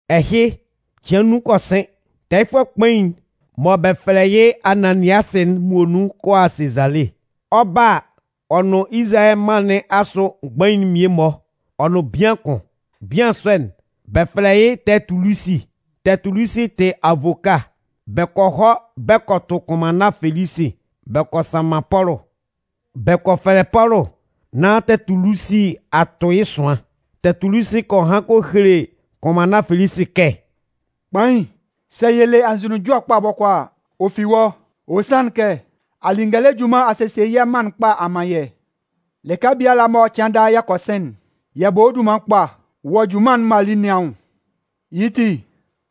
Ɛhɩ, cɩan nnun kɔ sɩn, tɛɛyɩfʋɛ kpain'n mɔ bɛ fɛlɛ yɩ́ Ananiasɩ'n muonun kɔ a Sezale. Ɔ 'ba a, ɔ nʋn Izalayɛ mân nɩn asʋ mgbain'n mmie-mɔ ɔ nʋn bian kʋn. Bian sɔ'n, bɛ fɛlɛ yɩ́ Tɛɛtulusi. Tɛɛtulusi tɩ avoka. Bɛ kɔ hɔ bɛ kɔ tʋ kʋnmanna Felisi bɛ kɔ sanman Pɔlʋ. Bɛ kɔ fɛlɛ Pɔlʋ nán Tɛɛtulusi a tʋn yɩ́ ɛsʋan. Tɛɛtulusi kɔ han kɔ hele kʋnmanna Felisi kɛ: “Kpain, sɛ yɛ le anzʋnunjɔ kpa bɔkɔɔ a, ɔ fi wɔ́. Ɔ sanlɩn kɛ a li ngɛlɛ junman a sesie yɛ̂ mân'n kpa a man yɛ́. Lɩka biala mɔ cɩan daa yɛ kɔ sɩn'n, yɛ bɔ wɔ́ dunman kpa wɔ junman'n mɔ a li nɩn anwʋn. Yɩ́ ti,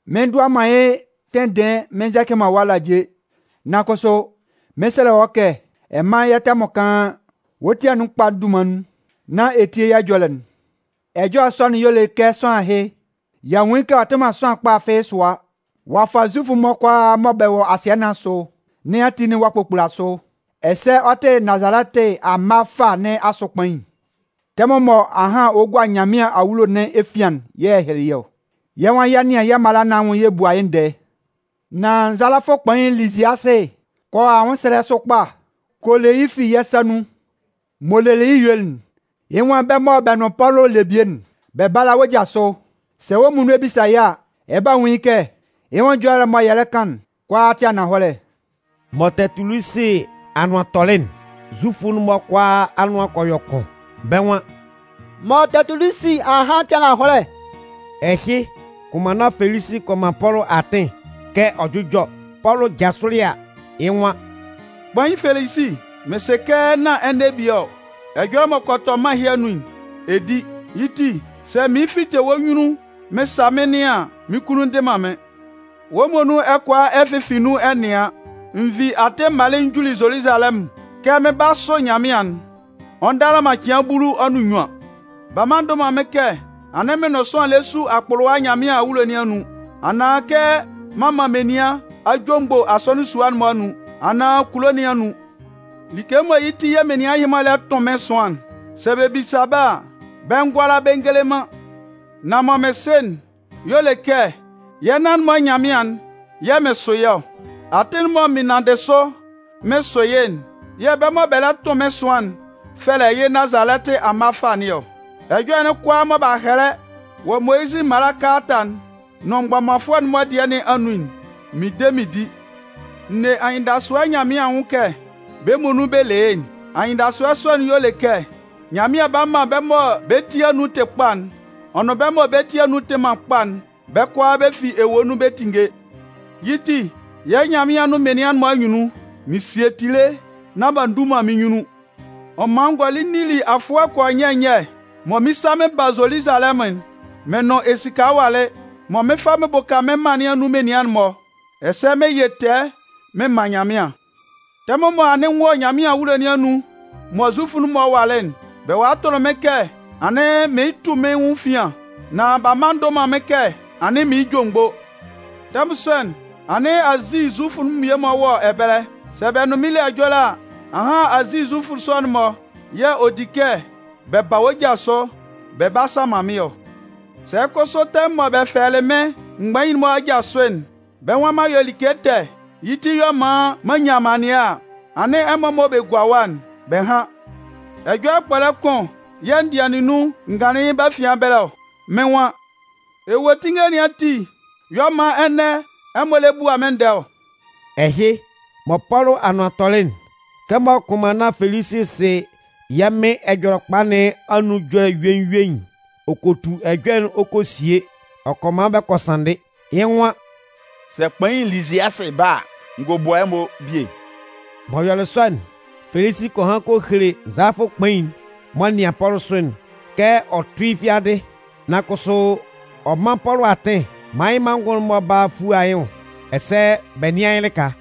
mɩn ndʋa man yɩ́ tɩndɩɩn mɩn nzɛcɩ wɔ́ alaje. Nan kʋsʋ, mɩn 'sɛlɛ wɔ́ kɛ ɛ mán yɛ́ tɛmʋn kaan, wɔ́ ti anun kpa'n dunman nun nán ɛ tíe yɛ́ ɛjɔlɛ'n. “Ɛjɔlɛ sɔ'n y'ɔ le kɛ sʋanlan ɛhɩ, y'a nwun yɩ́ kɛ ɔ tɩ man sʋanlan kpa fɩ́ɩ́ sʋa. Ɔ a fa Zufʋ'n-mɔ kʋalaa mɔ bɛ wɔ asɩɛ nɩn asʋ nɩn ati'n-mɔ ɔ'a kpokpula sʋ. Ɛsɛ ɔ tɩ Nazalɛtɩ amma fâ nɩn asʋ kpain. Tɛmʋn mɔ ahan ɔ 'gua Nyanmɩan awulo nɩn efian'n yɛ̂ yɛ hyɩlɩ yɩ́ ɔ. [Yɛ́ nwan yɛ 'nɩan yɛ́ mala nɩn anwʋn yɛ bua yɩ́ ndɛɛ. Nan nzalafʋ kpain Liziasɩ kɔ a anwʋnsɛlɛ sʋ kpa kɔ le yɩ́ fi yɛ̂ sa nun. M'ɔ lelɩ yɩ́ yuelɩ'n, yɩ́ nwan bɛ́ mɔ bɛ nʋn Pɔlʋ le bie'n, bɛ bála wɔ́ ja sʋ.] Sɛ wɔ́ muonun ɛ bisa yɩ́ a, ɛ 'ba nwun yɩ́ kɛ yɩ́ nwʋn ɛjɔlɛ'n mɔ yɛ lɛ kan'n kʋalaa tɩ ananhɔlɛ.” Mɔ Tɛɛtulusi anʋan tɔlɩ'n, Zufʋ'n-mɔ kʋalaa anʋan kɔ yɔ kʋn. Bɛ́ nwan: “Mɔ Tɛɛtulusi a han'n tɩ ananhɔlɛ.” Ɛhɩ, kʋnmanna Felisi kɔ man Pɔlʋ atɩn kɛ ɔ jʋ́jɔ. Pɔlʋ jasʋlɩ a, yɩ́ nwan: “Kpain Felisi, mɩn sɩ kɛ nán ɛnɛ bie ɔ, ɛjɔlɛ m'ɔ kɔ tɔ mân ɛhɩ anun'n, ɛ di. Yɩ́ ti, sɛ mɩɩn fite wɔ́ nyunnun mɩn sa mɩ́n nɩan an, mɩ́n kunnun ndɩ man mɩ́n. Wɔ́ muonun ɛ kʋala ɛ fɩnfɩn nun ɛ nɩan, n vi atɩn m malɩ n juli Zoluzalɛmʋn kɛ mɩn 'ba a sʋ Nyanmɩan'n, ɔ ndala man cɩan bulu ɔ nʋn nnyuan. B'a mma a ndʋ man mɩ́n kɛ anɩn mɩn nʋn sʋanlan lɛ su akpʋlʋwa Nyanmɩan awulo nɩn anun, anaan kɛ m'an man menian a jomgbo asɔnɩn sua'n-mɔ anun, anaan kulo nɩn anun. Like mɔ yɩ́ ti yɛ̂ menian ɛhɩ-mɔ lɛ tʋn mɩ́n ɛsʋan'n, sɛ bɛ bisa bɛ́ a, bɛ ngʋala bɛ ngele man. Nan mɔ mɩn sɩ'n y'ɔ le kɛ yɛ́ nan-mɔ Nyanmɩan'n yɛ̂ mɩn sʋ yɩ́ ɔ. Atɩn'n mɔ mɩn nanndɩ sʋ mɩn sʋ yɩ́'n yɛ̂ bɛ́ mɔ bɛ lɛ tʋn mɩ́n ɛsʋan'n fɛlɛ yɩ́ Nazalɛtɩ amma fâ nɩn ɔ. Ɛjɔlɛ'n kʋalaa mɔ b'a hɛlɛ wɔ Moyizɩ mala kalata'n nʋn mgbɔmanfʋɛ'n-mɔ dɩɛ nɩn anun'n, mɩn de mɩn di. N ne anyɩndasʋɛ Nyanmɩan anwʋn kɛ bɛ́ muonun bɛ le yɩ́'n. Anyɩndasʋɛ sɔ'n y'ɔ le kɛ Nyanmɩan 'ba man bɛ́ mɔ bɛ́ ti anun tɩ kpa'n, ɔ nʋn bɛ́ mɔ bɛ́ ti anun tɩ man kpa'n, bɛ́ kʋalaa bɛ fi ewue nun bɛ 'tinnge. Yɩ́ ti yɛ̂ Nyanmɩan nʋn menian'n-mɔ anyunnun, mɩn sie tile nán b'a ndu man mɩ́n nyunnun. “Ɔ man n gɔlɩ n nili afʋɛ kɔ yɔ nyɛ nyɛ mɔ mɩn 'sa mɩn ba Zoluzalɛmʋn'n, mɩn nʋn esika walɩ mɔ mɩn 'fa mɩn bʋka mɩ́n mân nɩn anun menian'n-mɔ, ɛsɛ mɩn yɩ tɛɛ mɩn man Nyanmɩan. Tɛmʋn mɔ anɩn n wɔ Nyanmɩan awulo nɩn anun mɔ Zufʋ'n-mɔ walɩ'n, bɛ walɩ tʋlɩ mɩ́n kɛ anɩn mɩɩn tu mɩ́n nwʋn efian. Nan b'a mma a ndʋ man mɩ́n kɛ anɩn mɩɩn jomgbo. Tɛmʋn sɔ'n, anɩn Azi Zufʋ mmie-mɔ wɔ ɛbɛlɛ. Sɛ bɛ nʋn mɩ́n le ɛjɔlɛ a, ahan Azi Zufʋ sɔ'n-mɔ yɛ̂ ɔ di kɛ bɛ ba wɔ́ ja sʋ bɛ 'ba a sanman mɩ́n ɔ. Sɛ kʋsʋ tɛmʋn mɔ bɛ fɛlɛlɩ mɩ́n mgbain'n-mɔ aja sʋ'n, bɛ́ nwan m'an yɔ like ɛtɛ, yɩ́ ti y'ɔ man m'an nyan amannɩɛ a, anɩn ɛmɔ mɔ bɛ gua ɛwa'n, bɛ hán. Ɛjɔlɛ kpɔlɛ kʋn yɛ̂ n dɩanlɩn nun n ganlɩn yɩ́ bɛ́ afian ɛbɛlɛ ɔ. Mɩ́n nwan: ‘Ewuetinnge nɩn ati yɛ̂ ɔ man ɛnɛ ɛmɔ lɛ bua mɩ́n ndɛɛ ɔ!’” Ɛhɩ, mɔ Pɔlʋ anʋan tɔlɩ'n, kɛmɔ kʋnmanna Felisi sɩ yɛ́ Mɩn Ɛjɔlɛkpa nɩn anun ɛjɔlɛ yuein yuein'n, ɔ kɔ tu ɛjɔlɛ'n ɔ kɔ sie ɔ kɔ man bɛ kɔ sanndɩ. Yɩ́ nwan: “Sɛ kpain Liziasɩ ba a, n gɔ bua ɛmɔ bie.” M'ɔ yɔlɩ sɔ'n, Felisi kɔ han kɔ hele nzalafʋ kpain'n m'ɔ nɩan Pɔlʋ sʋ'n kɛ ɔ tʋ́ yɩ́ fiadɩ. Nan kʋsʋ ɔ mán Pɔlʋ atɩn maan yɩ́ manngʋn'n-mɔ bála a fua yɩ́ nwʋn ɛsɛ bɛ nɩ́an yɩ́ lɩka.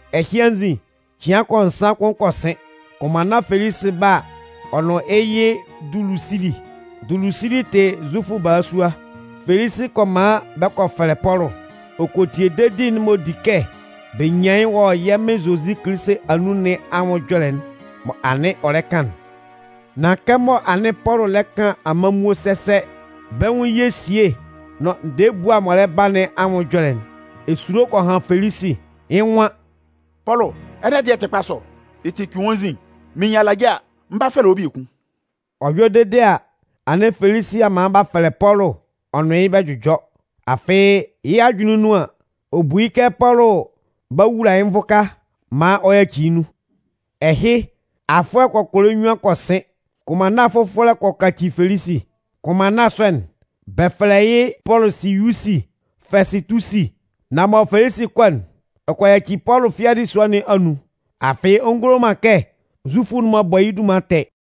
Ɛhɩ anzin, cɩan kɔ yɔ nsan kʋn kɔ sɩn, kʋnmanna Felisi 'ba a, ɔ nʋn yɩ́ yɩ Dulusili. Dulusili tɩ Zufʋ balasua. Felisi kɔ man bɛ kɔ fɛlɛ Pɔlʋ, ɔ kɔ tie dedi'n m'ɔ di kɛ bɛ nyan yɩ́ wɔ yɛ́ Mɩn Zozi Kilisi anun nɩn anwʋn ɛjɔlɛ'n mɔ anɩn ɔ lɛ kan'n. Nan kɛmɔ anɩn Pɔlʋ lɛ kan amanmuo sɛsɛ, bɛ́ nwʋn ye esíe nʋn ndɛɛ ebua'n m'ɔ lɛ ba nɩn anwʋn ɛjɔlɛ'n, esulo kɔ han Felisi, yɩ́ nwan: “Pɔlʋ, ɛnɛ dɩɛ'n tɩ kpa sɔ. Yɩ́ ti, cʋɩn wɔ́ nzin. Mɩn nyan alaje a, mɩn 'ba fɛlɛ wɔ́ biekun.” Ɔ yɔ dede a, anɩn Felisi a man b'a fɛlɛ Pɔlʋ ɔ nʋn yɩ́ bɛ jʋjɔ. Afɩ yɩ́ ajʋnlɩn nun an, ɔ bu yɩ́ kɛ Pɔlʋ b'a wula yɩ́ nvʋka maan ɔ yaci yɩ́ nun. Ɛhɩ, afʋɛ kɔkɔlɛ nnyuan kɔ sɩn, kʋnmanna fʋfɔlɛ kɔ a kɔ kaci Felisi. Kʋnmanna sɔ'n, bɛ fɛlɛ yɩ́ Pɔlʋsiyusi Fɛsɩtusi. Nan mɔ Felisi 'kɔ'n, ɔ kɔ yaci Pɔlʋ fiadɩ sua nɩn anun, afɩ ɔ ngulo man kɛ Zufʋ'n-mɔ bɔ yɩ́ dunman ɛtɛ.